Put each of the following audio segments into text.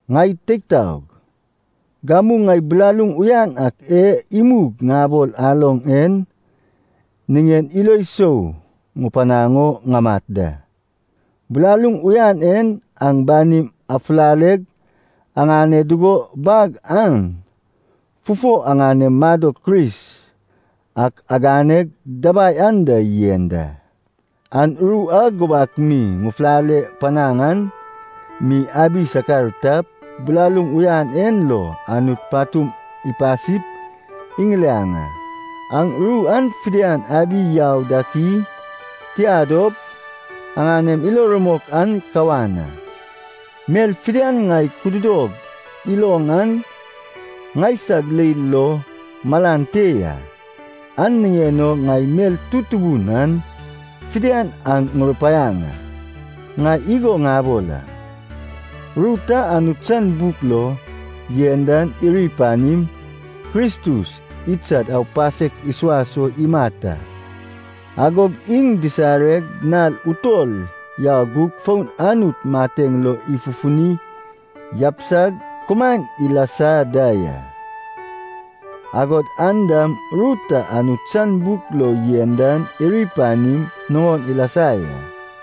Ŋai teig taog, gamu ŋai bilaluŋ uyan ak e imug ŋabol aloŋ en niŋen ilo sou ŋupanaŋ o ŋamat da. Bilaluŋ uyan en aŋ banim afulaleg aŋane dugo bag an fufo aŋanem madok Kris ak aganeg dabai anda yen da. Aŋ ru a gubak mi ŋufulale panaŋ an mi abi sakar tap, bilaluŋ uyan en lo Anut patum ipasip iŋiliaŋ a. Aŋ ru an fidian abi yau dak i? Tia dop, aŋanem ilo rumok an kawan a. Mel fidian ŋai kududog iloŋ an ŋaisag leil lo malan te ya, an niŋen o ŋai mel tutubu yan fidian aŋ ŋurupaiaŋ a. Ŋai igo ŋabol a. Ru ta Anut san buk lo yen dan iri panim, Kristus idsad aupasek isuas o imat a. Agog iŋ disareg nal utol yau gug fon Anut mateŋ lo ifufuni yabisag kumaen ilasa da ya. Agod an dam ru ta Anut san buk lo yen dan iri panim nuŋon ilasa ya.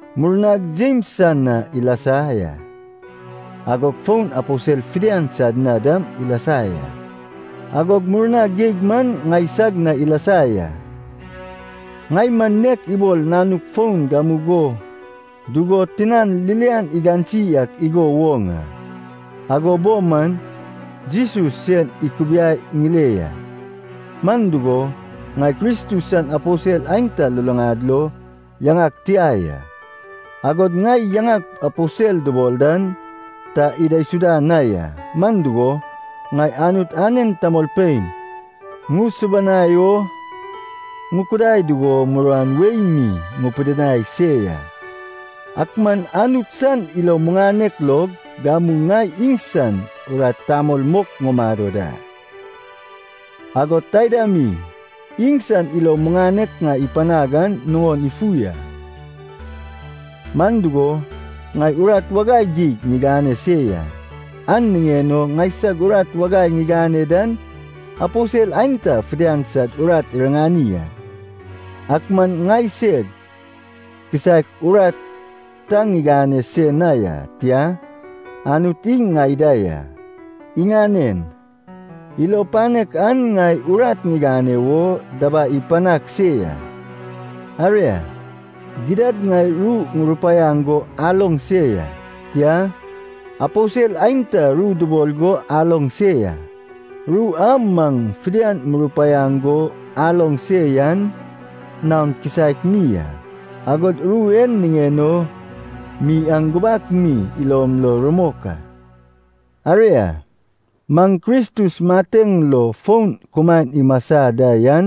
Murnag Jems san na ilasa ya, agog fon aposel fidian sad na dam ilasa ya. Agog murna geig man ŋaisag na ilasa ya. Ŋai man nek ibol nanuk foun gamugo dugo tinan ririan igansi ak igo woŋ a, ago bo man Jesus sen ikubiai ŋile ya. Man dugo, ŋai Kristus san aposel aenta luluŋad lo yaŋag tia ya, agod ŋai yaŋag aposel dubol dan ta idaisuda na ya. Man dugo, ŋai Anut anen tamolpein ŋusubanai o ŋukudai dugo muruan wei mi ŋupidinai se ya. Ak man Anut san ilo muŋanek log gamu ŋai iŋsan urat tamol mok ŋumado da. Agod taida mi, iŋsan ilo muŋanek ŋai ipanag an nuŋon ifu a, man dugo, ŋai urat wagai geig ŋigane se ya, an niŋen o ŋaisag urat wagai ŋigane dan aposel aenta fidian sad urat iriŋani a. Ak man ŋai seg kisaek urat ta ŋigane se na ya, tia, Anut iŋ ŋai da ya, iŋanen ilo panek an ŋai urat ŋigane wo dabai ipanag se ya. Aria, gidad ŋai ru ŋurupaiaŋ go aloŋ se ya, tia, aposel aenta ru dubol go aloŋ se ya, ru a maŋ fidian murupaiaŋ go aloŋ se yan naon kisaek mi ya, agod ru en niŋen o mi aŋ gubak mi ilom lo rumok a. Aria, maŋ Kristus mateŋ lo fon kumaen imasa da yan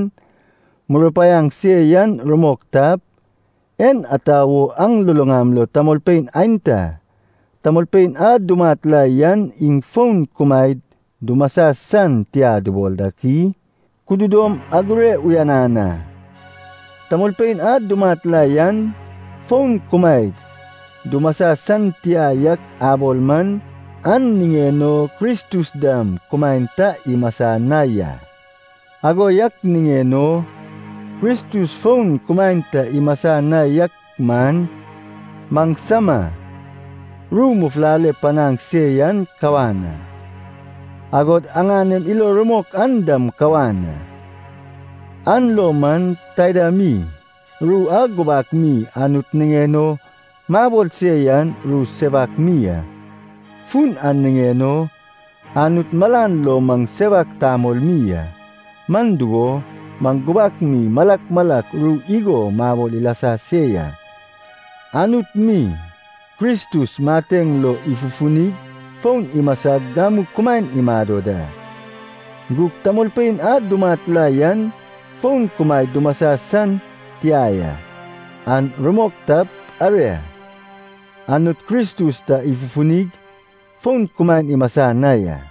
murupaiaŋ se yan rumok tap, en ata wo aŋ luluŋam lo tamolpein aenta, tamolpein a dumat la yan iŋ fon kumaed dumasa san tia dubol dak i? Kududom agure uyanan a. Tamolpein a dumat la yan fon kumaed dumasa san tia yak abol man, an niŋen o Kristus dam kumaen ta imasa na ya. Ago yak niŋen o, Kristus fon kumaen ta imasa na yak man, maŋsama ru mufulale panaŋ se yan kawan a, agod aŋanem ilo rumok an dam kawan a. An lo man, taida mi ru a gubak mi Anut niŋen o mabol se yan ru sewak mi a. Fun an niŋen o Anut malan lo maŋ sewak tamol mi a, man dugo, maŋ gubak mi malak malak ru igo mabol ilasa se ya, Anut mi Kristus mateŋ lo ifufunig fon imasag gamu kumaen imado da. Gug tamolpein a dumat la yan fon kumaed dumasa san tia ya, an rumok tap, aria, Anut Kristus ta ifufunig fon kumaen imasa na ya.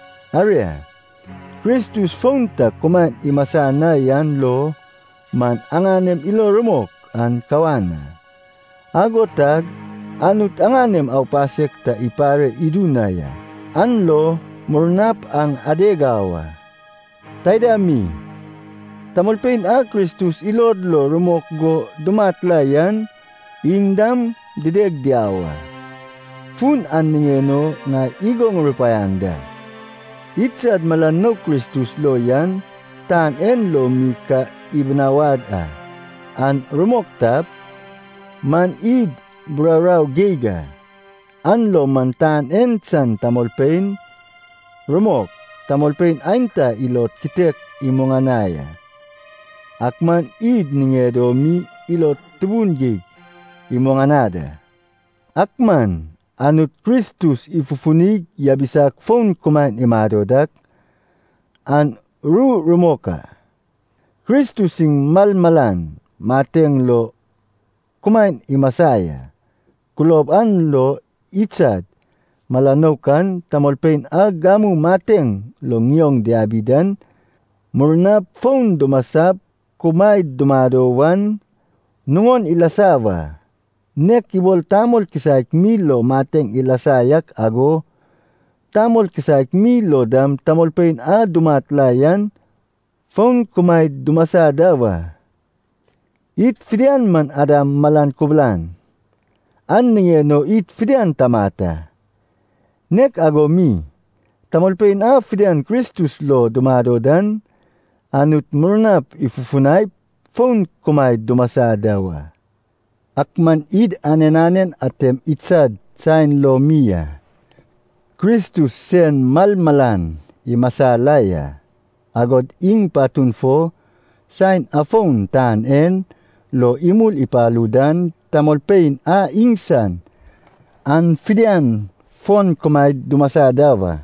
Aria, Kristus fon ta kumaen imasa na yan lo man, aŋanem ilo rumok an kawan a, ago tag Anut aŋanem aupasek ta ipare idu na ya. An lo murnap aŋ adeg au a. Taida mi, tamolpein a Kristus ilod lo rumok go dumat la yan, iŋ dam dideg diau a. Fun an niŋen o ŋai igo ŋurupaiaŋ da. Idsad mala nouk Kristus lo yan tan en lo mi ka ibinawad a, an rumok tap, man id buraurau geig a. An lo man tan en san tamolpein, rumok, tamolpein aenta ilod kitek imuŋanai a, ak man id niŋed o mi ilod tubun geig imuŋanad a. Ak man Anut Kristus ifufunig yabisag fon kumaen imado dak, an ru rumok a. Kristus iŋ malmalan mateŋ lo kumaen imasa ya, kulob an lo idsad mala nouk an, tamolpein a gamu mateŋ lo ŋioŋ diabi dan murnap fon dumasap kumaed dumado wan, nuŋon ilasa wa. Nek ibol tamol kisaek mi lo mateŋ ilasa yak ago, tamol kisaek mi lo dam tamolpein a dumat la yan fon kumaed dumasa da wa. Id fidian man Adam malan kubulan, an niŋen o id fidian tamat a. Nek ago mi, tamolpein a fidian Kristus lo dumado dan, Anut murnap ifufunaip fon kumaed dumasa da wa. Ak man id anen anen atem idsad saen lo mi a. Kristus sen malmalan imasa la ya, agog iŋ patun fo, saen afon tan en lo imul ipalu dan, tamolpein a iŋsan an fidian fon kumaed dumasa da wa.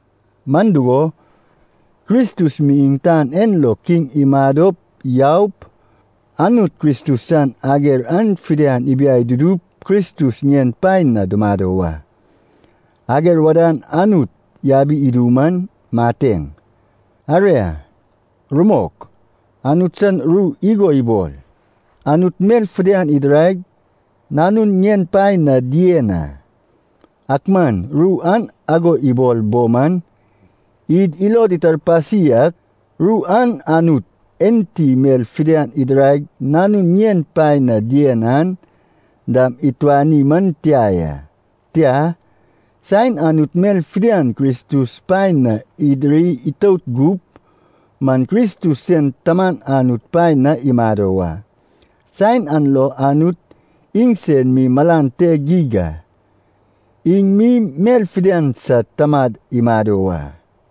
Man dugo, Kristus mi tan en lo kiŋ imadop yaup, Anut Kristus san ager an fidian ibiai dudup Kristus ŋien paen na dumado wa. Ager wadan Anut yabi idu man mateŋ. Aria, rumok, Anut san ru igo ibol, “Anut mel fidian idiraig nanun ŋien paen na dien a.” Ak man ru an ago ibol bo man, id ilod itarpasi ak, ru an Anut enti mel fidian idiraig nanun ŋien paen na dien an dam ituani man tia ya. Tia, saen Anut mel fidian Kristus paen na idiri itout gup man Kristus sen Taman Anut paen na imado wa. Saen an lo Anut iŋsen mi malan te geig a, iŋ mi mel fidian sad tamad imado wa.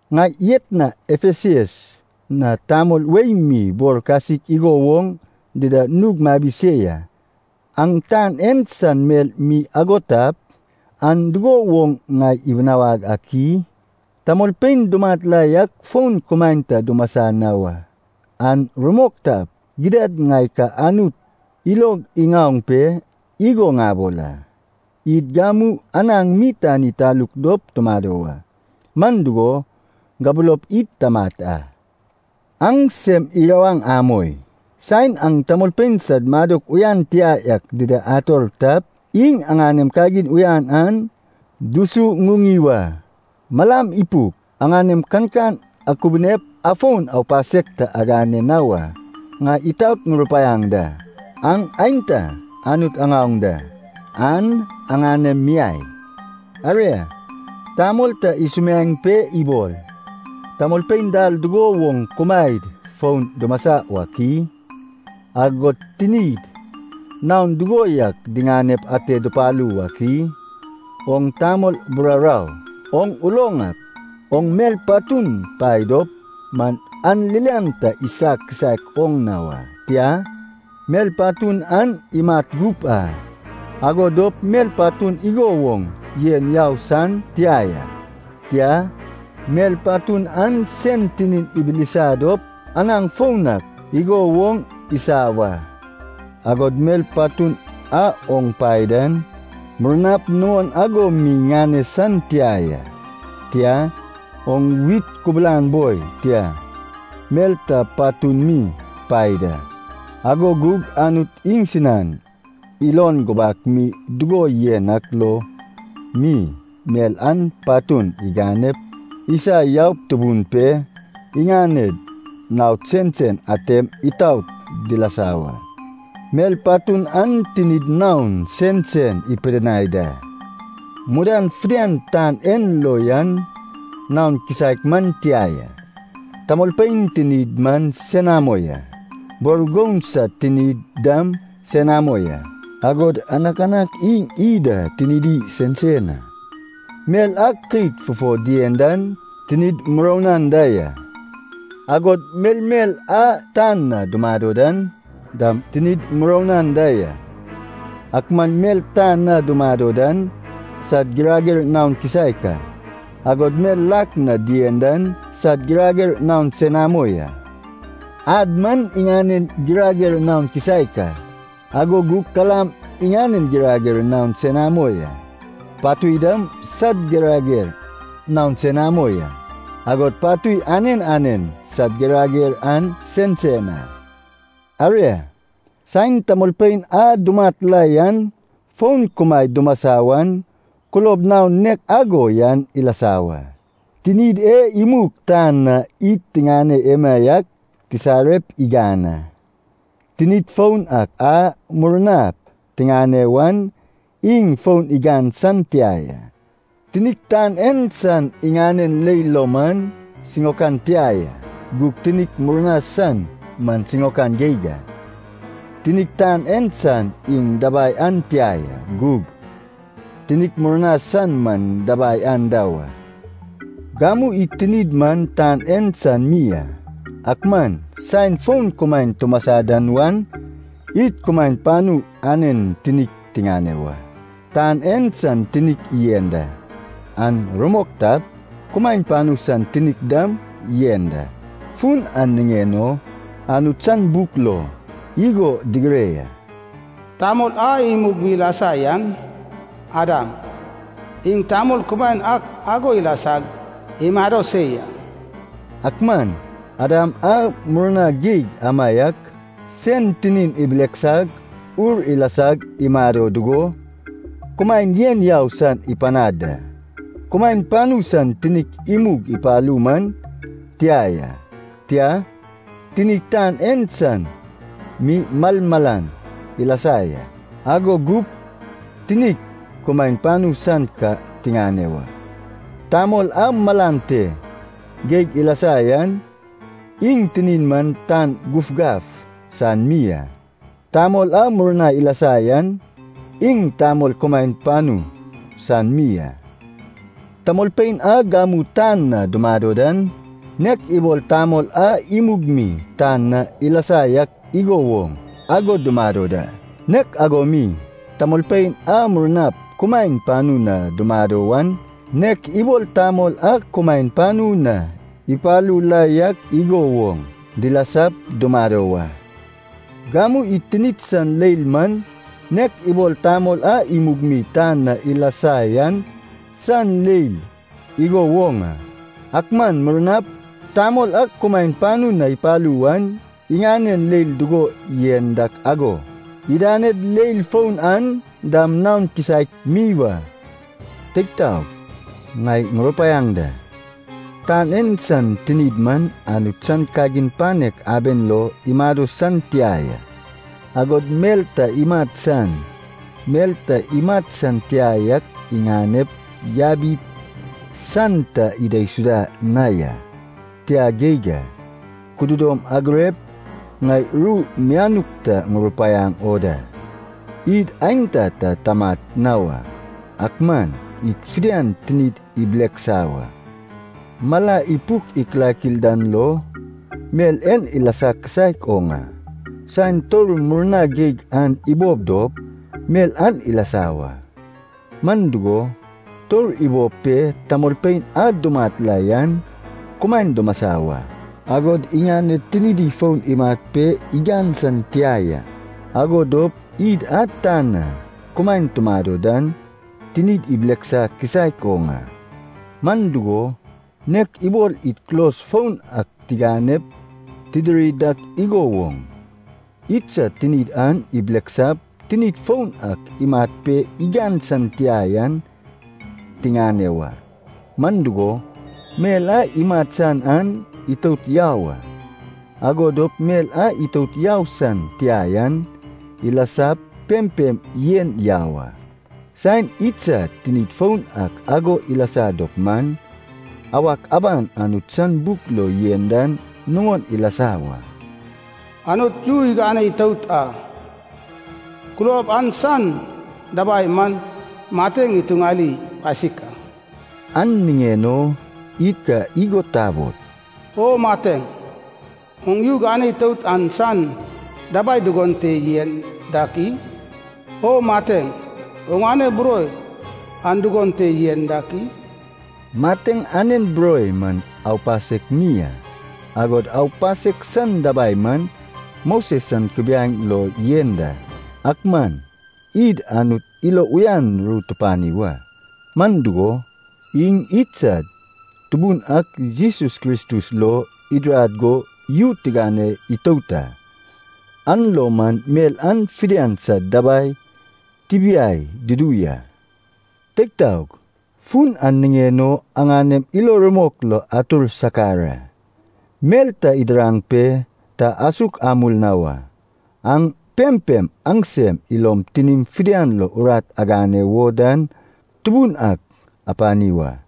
Ŋai etna Efesas na tamol wei mi bor kasik igo woŋ dida nug mabi se ya. An tan en san mel mi ago tap, an dugo woŋ ŋai ibinawag ak i? Tamolpein dumat la yak fon kumaen ta dumasa na wa, an rumok tap, gidad ŋai ka Anut ilog iŋaoŋ pe igo ŋabol a, “Id gamu anaŋ mi tani taluk dop tumado wa, man dugo, gabulop id tamat a.” Aŋ sem irawaŋ amoi, saen aŋ tamolpein sad madok uyan tia yak dida ator tap, iŋ aŋanem kagin uyan an dusuŋuŋi wa. Malam ipuk, aŋanem kankan akubunep afon aupasek ta agane na wa. Ŋai itaot ŋurupaiaŋ da, aŋ aenta Anut aŋaoŋ da, an aŋanem miai. Aria, tamol ta isumiaeŋ pe ibol, “Tamolpein dal dugo woŋ kumaed fon dumasa wak i? Agod tinid naon dugo yak diŋanep ate dupalu wak i?” Oŋ tamol buraurau! Oŋ uloŋ ak, oŋ mel patun pae dop man an ririan ta isa kisaek oŋ na wa. Tia, mel patun an imat gup a. Ago dop mel patun igo woŋ yen yau san tia ya, tia, mel patun an sen tinin ibilisa dop anaŋ foun ak igo woŋ isa wa. Agod mel patun a oŋ pae dan, murnap nuŋon ago mi ŋane san tia ya. Tia, oŋ wit kubulan boi, tia, mel ta patun mi pae da. Ago gug Anut iŋsinan ilon gubak mi dugo yen ak lo mi, mel an patun iganep isa yaup tubun pe, iŋaned naod sensen atem itaot dilasa wa. Mel patun an tinid naon sensen ipidinai da. Mudan fidian tan en lo yan naon kisaek man tia ya. Tamolpein tinid man senamo ya, bor goun sad tinid dam senamo ya, agod anakanak iŋ iy da tinidi sensen a. Mel a keit fufo dien dan tinid muroun anda ya, agod melmel a tan na dumado dan dam tinid muroun anda ya. Ak man mel tan na dumado dan sad girager naon kisaek a, agod mel lak na dien dan sad girager naon senamo ya. Ad man iŋanen girager naon kisaek a, ago gug kalam iŋanen girager naon senamo ya, patui dam sad girager naon senamo ya. Agod patui anen anen sad girager an sensen a. Aria, saen tamolpein a dumat la yan fon kumaed dumasa wan, kulob naon nek ago yan ilasa wa. Tinid e imug tan na id tiŋane emaiak tisarep igan a. Tinid foun ak a murnap tiŋane wan iŋ fon igan san tia ya. Tinik tan en san iŋanen leil lo man siŋaokan tia ya, gug tinik murna san man siŋaokan geig a. Tinik tan en san iŋ dabai an tia ya, gug tinik murna san man dabai anda wa. Gamu id tinid man tan en san mi a, ak man saen fon kumaen tumasa da wan, id kumaen panu anen tinik tiŋane wa. Tan en san tinik yen da, an rumok tap, kumaen panu san tinik dam yen da. Fun an niŋen o Anut san buk lo igo digire ya, “Tamol a imug mi ilasa yan, Adam, iŋ tamol kumaen ak ago ilasag imado se ya.” Ak man Adam a murna geig amaiak, sen tinin ibileksag ur ilasag imado dugo, kumaen yen yau san ipanad da. Kumaen panu san tinik imug ipalu man tia ya, tia, tinik tan en san mi malmalan ilasa ya. Ago gup tinik kumaen panu san ka tiŋane wa. Tamol a malan te geig ilasa yan, iŋ tinin man tan gufgaf san mi a. Tamol a murna ilasa yan, iŋ tamol kumaen panu san mi a. Tamolpein a gamu tan na dumado dan, nek ibol tamol a imug mi tan na ilasa yak igo woŋ ago dumado da. Nek ago mi, tamolpein a murnap kumaen panu na dumado wan, nek ibol tamol a kumaen panu na ipalu la yak igo woŋ, dilasap dumado wa. Gamu id tinid san leil man nek ibol tamol a imug mi tan na ilasa yan san leil igo woŋ a. Ak man murnap, tamol a kumaen panu na ipalu wan, iŋanen leil dugo yen dak ago, idaned leil foun an dam naon kisaek mi wa. Teig taog, ŋai ŋurupaiaŋ da, tan en san tinid man Anut san kagin panek aben lo imado san tia ya, agod mel ta imat san, mel ta imat san tia yak iŋanep yabi san ta idaisuda na ya, tia geig a. Kududom agurep ŋai ru mianuk ta ŋurupaiaŋ o da. Id aenta ta tamat na wa, ak man id fidian tinid ibileksa wa. Mala ipuk ikilakil dan lo, mel en ilasa kisaek oŋ a. Saen tour murna geig an ibob dop, mel an ilasa wa. Man dugo, tour ibob pe tamolpein a dumat la yan kumaen dumasa wa, agod iŋaned tinidi fon imat pe igan san tia ya. Ago dop id a tan na kumaen tumado dan tinid ibileksa kisaek oŋ a. Man dugo, nek ibol id kulos foun ak tiŋanep tidiri dak igo woŋ, idsad tinid an ibileksap tinid foun ak imat pe igan san tia yan tiŋane wa. Man dugo, mel a imat san an itout yau a, ago dop mel a itout yau san tia yan ilasap pempem yen yau a. Saen idsad tinid foun ak ago ilasa dop man, awak aban Anut san buk lo yen dan nuŋon ilasa wa. “Anut yu igane itout a, kulob an san dabai man mateŋ ituŋali pasik a.” An niŋen o id ka igo tabol, “O mateŋ, oŋ yu gane itout an san dabai dugon te yen dak i? O mateŋ, oŋane buroi an dugon te yen dak i?” Mateŋ anen buroi man aupasek mi a, agod aupasek san dabai man Moses san kubiaeŋ lo yen da. Ak man id Anut ilo uyan ru tupani wa! Man dugo, iŋ idsad Tubun ak Jesus Kristus lo idirad go yu tigane itout a, an lo man mel an fidian sad dabai tibiai dudu ya. Teig taog, fun an niŋen o aŋanem ilo rumok lo atur sakar a. Mel ta idiraŋ pe ta asuk amul na wa. Aŋ pempem aŋsem ilom tinim fidian lo urat agane wo dan Tubun ak apani wa.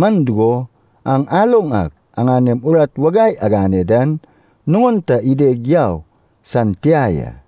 Man dugo, aŋ aloŋ ak aŋanem urat wagai agane dan nuŋon ta ideg yau san tia ya.